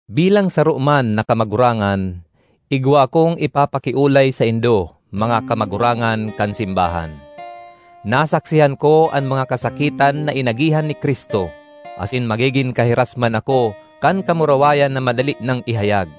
Bilang saro man na kamagurangan, igwa akong ipapakiolay saindo, mga kamagurangan kan simbahan. Nasaksihan ko an mga kasakitan na inagihan ni Cristo, asin magigin kahiras man ako kan kamurawayan na madali nang ihayag.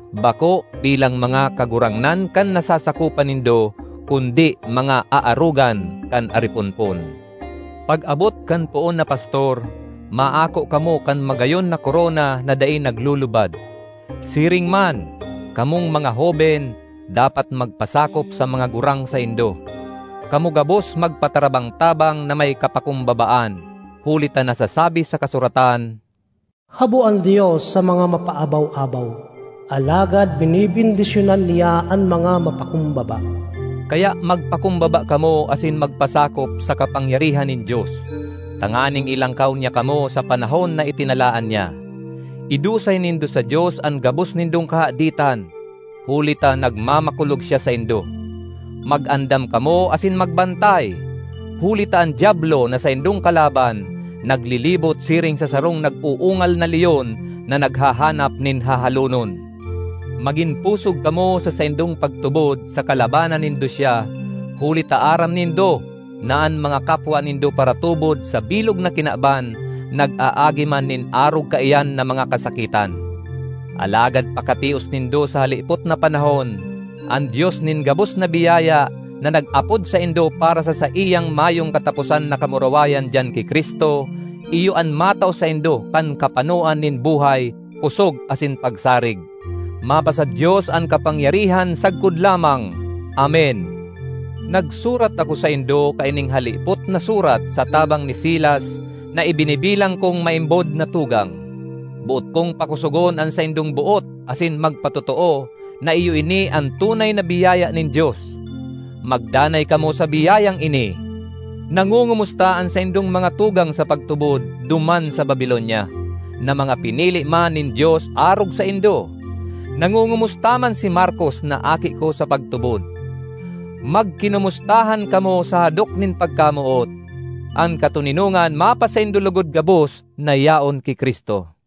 bako bilang mga kagurangnan kan nasasakopan nindo, kundi mga aarogan kan ariponpon. Pag-abot kan Poon na Pastor, maako kamo kan magayon na korona na dai naglulubad. Siring man, kamong mga hoben dapat magpasakop sa mga gurang saindo. Kamo gabos magpatarabang-tabang na may kapakumbabaan, huli ta nasasabi sa kasuratan, “Habo an Dios sa mga mapaabaw-abaw, alagad benebendisyonan niya an mga mapakumbaba.” Kaya magpakumbaba kamo asin magpasakop sa kapangyarihan nin Dios, tanganing ilangkaw niya kamo sa panahon na itinalaan niya. Idusay nindo sa Dios an gabos nindong kahaditan, huli ta nagmamakulog siya saindo. Mag-andam kamo asin magbantay! Huli ta an Diablo na saindong kalaban naglilibot siring sa sarong nag-uungal na leon na naghahanap nin hahalonon. Magin pusog kamo sa saindong pagtubod saka labanan nindo siya, huli ta aram nindo na an mga kapwa nindo paratubod sa bilog na kinaban nag-aagi man nin arog kaiyan na mga kasakitan. Alagad pakatios nindo sa halipot na panahon, an Dios nin gabos na biyaya, na nag-apod saindo para sa saiyang mayong kataposan na kamurawayan diyan ki Cristo, iyo an matao saindo kan kapanoan nin buhay, kosog asin pagsarig. Mapasa-Dios an kapangyarihan sagkod lamang! Amen. Nagsurat ako saindo kaining halipot na surat sa tabang ni Silas na ibinibilang kong maimbod na tugang. Boot kong pakosogon an saindong boot asin magpatotoo na iyo ini an tunay na biyaya nin Dios. Magdanay kamo sa biyayang ini. Nangongomusta an saindong mga tugang sa pagtubod duman sa Babilonia, na mga pinili man nin Dios arog saindo; nangongomusta man si Markos na aki ko sa pagtubod. Magkinomustahan kamo sa hadok nin pagkamoot. An katoninongan mapasaindo logod gabos na yaon ki Cristo.